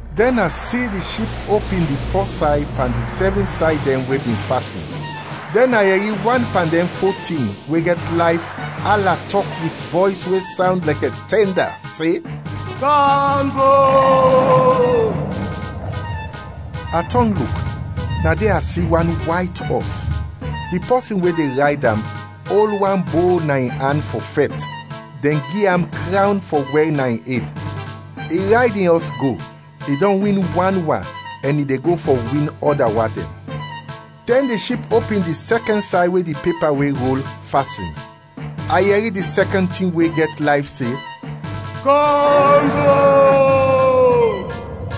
Dɛn a si di Ship opin di fɔs say pan di sɛvin say dɛn we bin fasin, dɛn a yɛri wan pan dɛn fo tin we gɛt layf ala tɔk wit vɔys we sawnd lɛkɛ tɛnda se, “Kam go!” A tɔn luk, na de a si wan wayt ɔs. Di pɔsin we de rayd am, ol wan bo na in an fɔ fɛt, dɛn gi am krawn fɔ wɛr na in ed. I rayd in ɔs go, i dɔn win wan wa ɛn i de go fɔ win ɔda wa dɛn. Dɛn di Ship opin di sɛkɛn say we di pepa we rol, fasin; a yɛri di sɛkɛn tin we gɛt layf se, “Kam go!”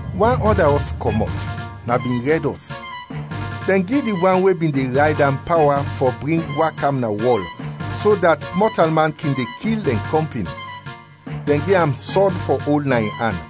Wan ɔda ɔs kɔmɔt, na bin rɛd ɔs. Dɛn gi di wan we bin de rayd am pawa fɔ bring wa kam na wɔl so dat mɔtalman kin de kil dɛn kɔmpin; dɛn gi am sɔd fɔ ol na in an.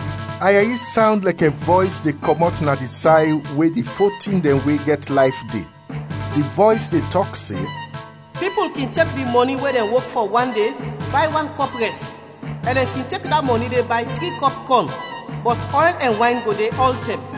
A yɛri sawnd lɛkɛ vɔys de kɔmɔt na di say we di fo tin dɛn we gɛt layf de. Di vɔys de tɔk se, “Pipul kin tek di mɔni we dɛn wok fɔ wan de bay wan kɔp rɛs, ɛn dɛn kin tek da mɔni de bay tri kɔp kɔn. Bɔt ɔyl ɛn wayn go de ɔltɛm.”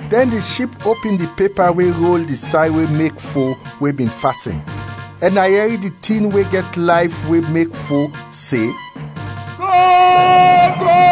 Dɛn di Ship opin di pepa we rol di say we mek fo we bin fasin, ɛn a yɛri di tin we gɛt layf we mek fo, se, “Kam go!”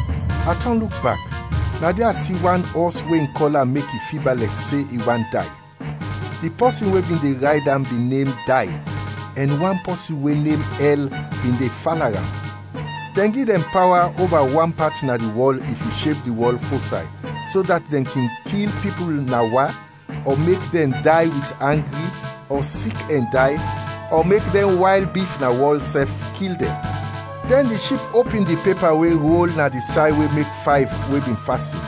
A tɔn luk bak, na de a si wan ɔs we in kɔla mek i fiba lɛkɛ se i want day. Di pɔsin we bin de rayd am bin nem Day, ɛn wan pɔsin we nem Ɛl bin de fala am. Dɛn gi dɛn pawa oba wan pat na di wɔl if yu sheb di wɔl fo say, so dat dɛn kin kil pipul na wa, ɔ mek dɛn day wit angri, ɔ sik ɛn day, ɔ mek dɛn wayl bif na wɔl sɛf kil dɛn. Dɛn di Ship opin di pepa we rol na di say we mek fayv we bin fasin.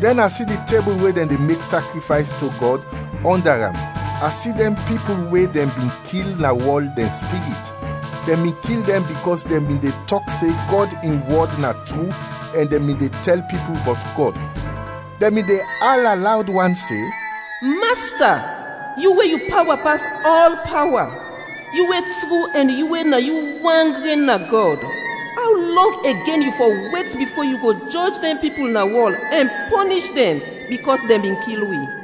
Dɛn a si di tebul we dɛn de mek sakrifays to Gɔd, ɔnda am, a si dɛn pipul we dɛn bin kil na wɔl dɛn spirit; dɛn bin kil dɛn bikɔs dɛn bin de tɔk se Gɔd in wɔd na tru ɛn dɛn bin de tɛl pipul bɔt Gɔd. Dɛn bin de ala lawd wan se, “Masta, yu we yu pawa pas ɔl pawa, yu we tru ɛn yu we na yu wan gren na Gɔd, aw lɔng igen wi fɔ wet bifo yu go jɔj dɛn pipul na wɔl ɛn pɔnish dɛn bikɔs dɛn bin kil wi?”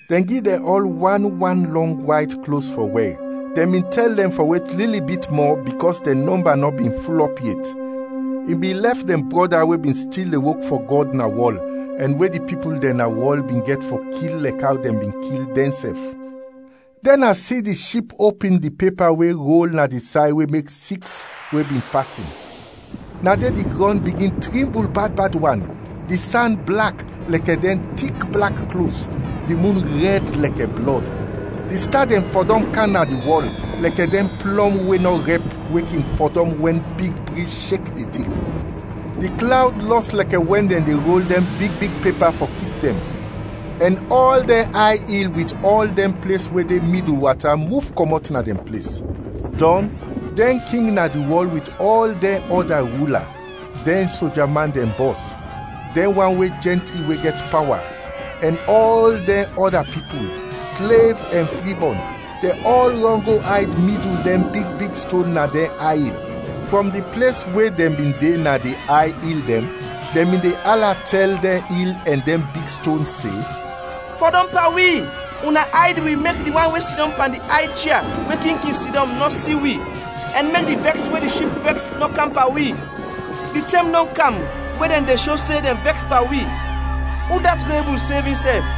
Dɛn gi dɛn ɔl wan wan lɔng wayt klos fɔ wɛr; dɛn bin tɛl dɛn fɔ wet lili bit mɔ bikɔs dɛn nɔmba nɔ bin fulɔp yet, i bin lɛf dɛn brɔda we bin stil de wok fɔ Gɔd na wɔl ɛn we di pipul dɛn na wɔl bin gɛt fɔ kil lɛkɛ aw dɛn bin kil dɛnsɛf. Dɛn a si di Ship opin di pepa we rol na di say we mek siks we bin fasin. Na de di grɔn bigin trimbul bad bad wan, di san blak, lɛkɛ dɛn tik blak klos, di mun rɛd lɛkɛ blɔd. Di sta dɛn fɔdɔm kam na di wɔl, lɛkɛ dɛn plɔm we nɔ rɛp we kin fɔdɔm wɛn big briz shek di tik. Di klawd lɔs lɛkɛ wɛn dɛn de rol dɛn big big pepa fɔ kip dɛn, ɛn ɔl dɛn ay il wit ɔl dɛn ples we de midul wata muf kɔmɔt na dɛn ples. Dɔn, dɛn king na di wɔl wit ɔl dɛn ɔda rula, dɛn soja man dɛn bɔs, dɛn wan we jɛntri we gɛt pawa, ɛn ɔl dɛn ɔda pipul, slev ɛn fribɔn, dɛn ɔl rɔn go ayd midul dɛn big big ston na dɛn ay il. Frɔm di ples we dɛn bin de na di ay il dɛn, dɛn bin de ala tɛl dɛn il ɛn dɛn big ston se, “Fɔdɔm pan wi, una ayd wi mek di wan we sidɔm pan di ay chia we king kin sidɔm nɔ si wi ɛn mek di vɛks we di Ship vɛks nɔ kam pan wi! Di tɛm dɔn kam we dɛn de sho se dɛn vɛks pan wi, udat go ebul sev insɛf?”